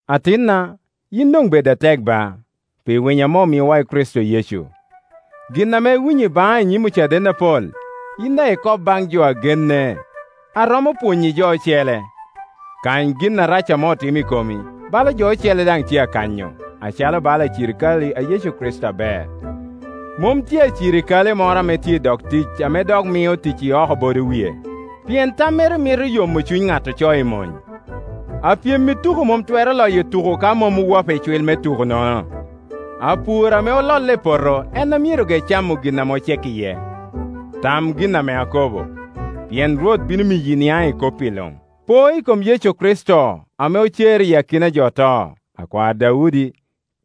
Atinna, yin doŋ bed atek ba, pi winyo ame omiowa i Kricito Yecu. Gin ame iwinyo i baŋa i nyim ocaden apol, yin daŋ ikob baŋ jo a genne a romo pwonyo i jo ocele. Kany gin arac ame otimo i komi, bala jo ocele daŋ tye akanyo, acalo bala acirikale a Yecu Kricito aber. Mom tye acirikale moro a tye i dog tic ame dok mio tic i oko bodo wie, pien tammere mito yomo cuny ŋat ocoe i mony. Apyem i tuko mom twero loyo tuko ka mom owapo icwil me tukonono. Apur ame ololle i poto en ame myero ge camo gin ame ocek iye. Tam gin ame akobo, pien Rwot bino miyi iniaŋ i kop-pi luŋ. Po i kom Yecu Kricito, ame ocer iyi akina a jo oto, akwar Daudi,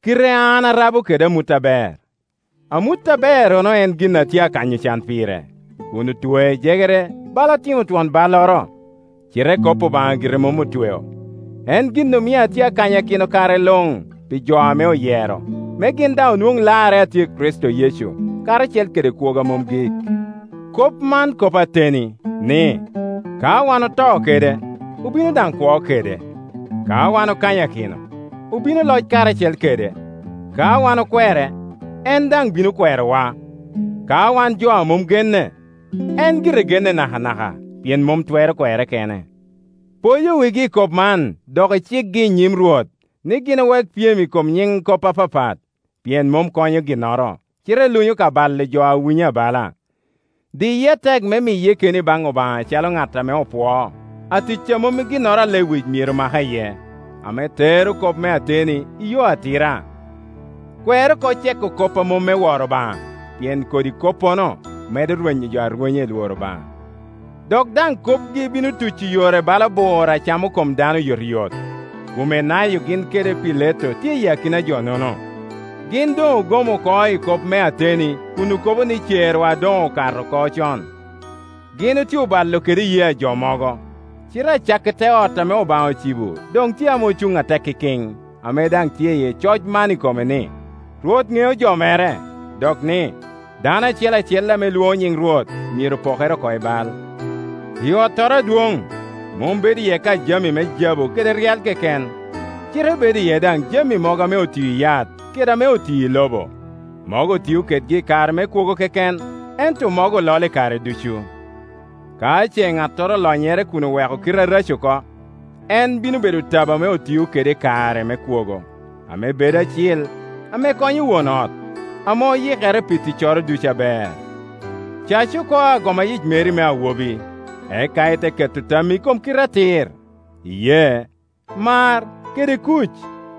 kite a an arabo kede amut aber. Amut aberrono en gin ame atye akanyo can pire, kun otwea i jegere bala atimo twon balloro! Cite kop Obaŋa gire mom otweo. En gin omio atye akanyakino kare luŋ, pi jo ame oyero, me gin daŋ onwoŋ larre a tye i Kricito Yecu, karacel kede kwogo a mom gik. Kop man kop ateni, ni, “Ka wan oto kede, obino daŋ kwo kede; ka wan okanyakino, obino loc karacel kede; ka wan okwere, en daŋ bino kwerowa; ka wan jo a mom genne, en gire genne nakanaka, pien mom twero kwerre kene.” Poyo wigi i kop man, dok icikgi i nyim Rwot, ni gin owek pyem i kom nyiŋ kop apapat, pien mom konyo ginnoro, cite lunyo ka balo jo a winyo abala. Diye atek me miye keni baŋ Obaŋa acalo ŋat ame opwoo, atic a mom i ginnoro a lewic myero make iye, ame tero kop me ateni i yo atira. Kwer oko ceko kop a mom me woro Obaŋa, pien kodi koppono medo rwenyo jo arwenya i lworo Obaŋa, dok daŋ kopgi bino tuco yore bala bur a camo kom dano oyotoyot. Kumenayo gin kede Pileto tye i akina a jo-nono. Gin doŋ ogom oko i kop me ateni kun okobo ni cerwa doŋ okato oko con. Gin otye obalo kede iyee ajo mogo. Cite acakki te ot ame Obaŋa ocibo doŋ tye ame ocuŋ atek ikin, ame daŋ i tye coc man i kome ni, “Rwot ŋeo jo mere,” dok ni, “Dano acel acel ame lwono nyiŋ Rwot myero pokere oko i bal.” I ottoro adwoŋ, mom bedo iye ka jami me jabu kede ryal keken, cite bedo iye daŋ jami mogo ame otio i yat kede ame otio i lobo; mogo otio kedgi i kare me kwogo keken, ento mogo ololo i kare ducu. Ka ce ŋattoro olonyere kun oweko kite areco oko, en bino bedo tabo ame otio kede i kare me kwogo, ame bedo acil, ame konyo won ot, ame oyikere pi ticcoro ducu aber. Cac oko agoma yic meri me awobi, eka ite keto tammi i kom kite atir, iyee, mar, kede kuc,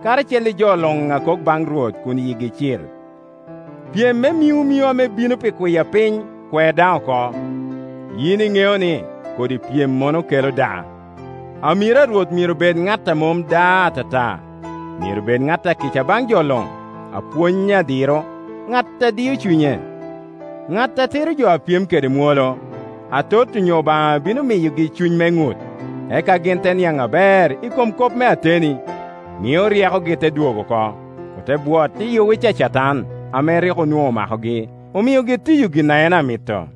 karacel i jo luŋ a kok baŋ Rwot kun yigi cil. Pyem me miŋomino ame bino pi kwiapiny kwer daŋ oko; yin iŋeo ni kodi pyemmono kelo daa. Amiro a Rwot myero bed ŋat a mom da atata, myero bed ŋat akica baŋ jo luŋ, apwony adiro, ŋat a dio cunye, ŋat a tiro jo a pyem kede mwolo, Atot onyo Obaŋa bino miyogi cuny me ŋut, eka gin te niaŋ aber i kom kop me ateni, mio ryekogi te dwogo oko, ote bwot iyi owic a Catan, ame rik onwoŋo omakogi, omiogi tiyo gin en a mito.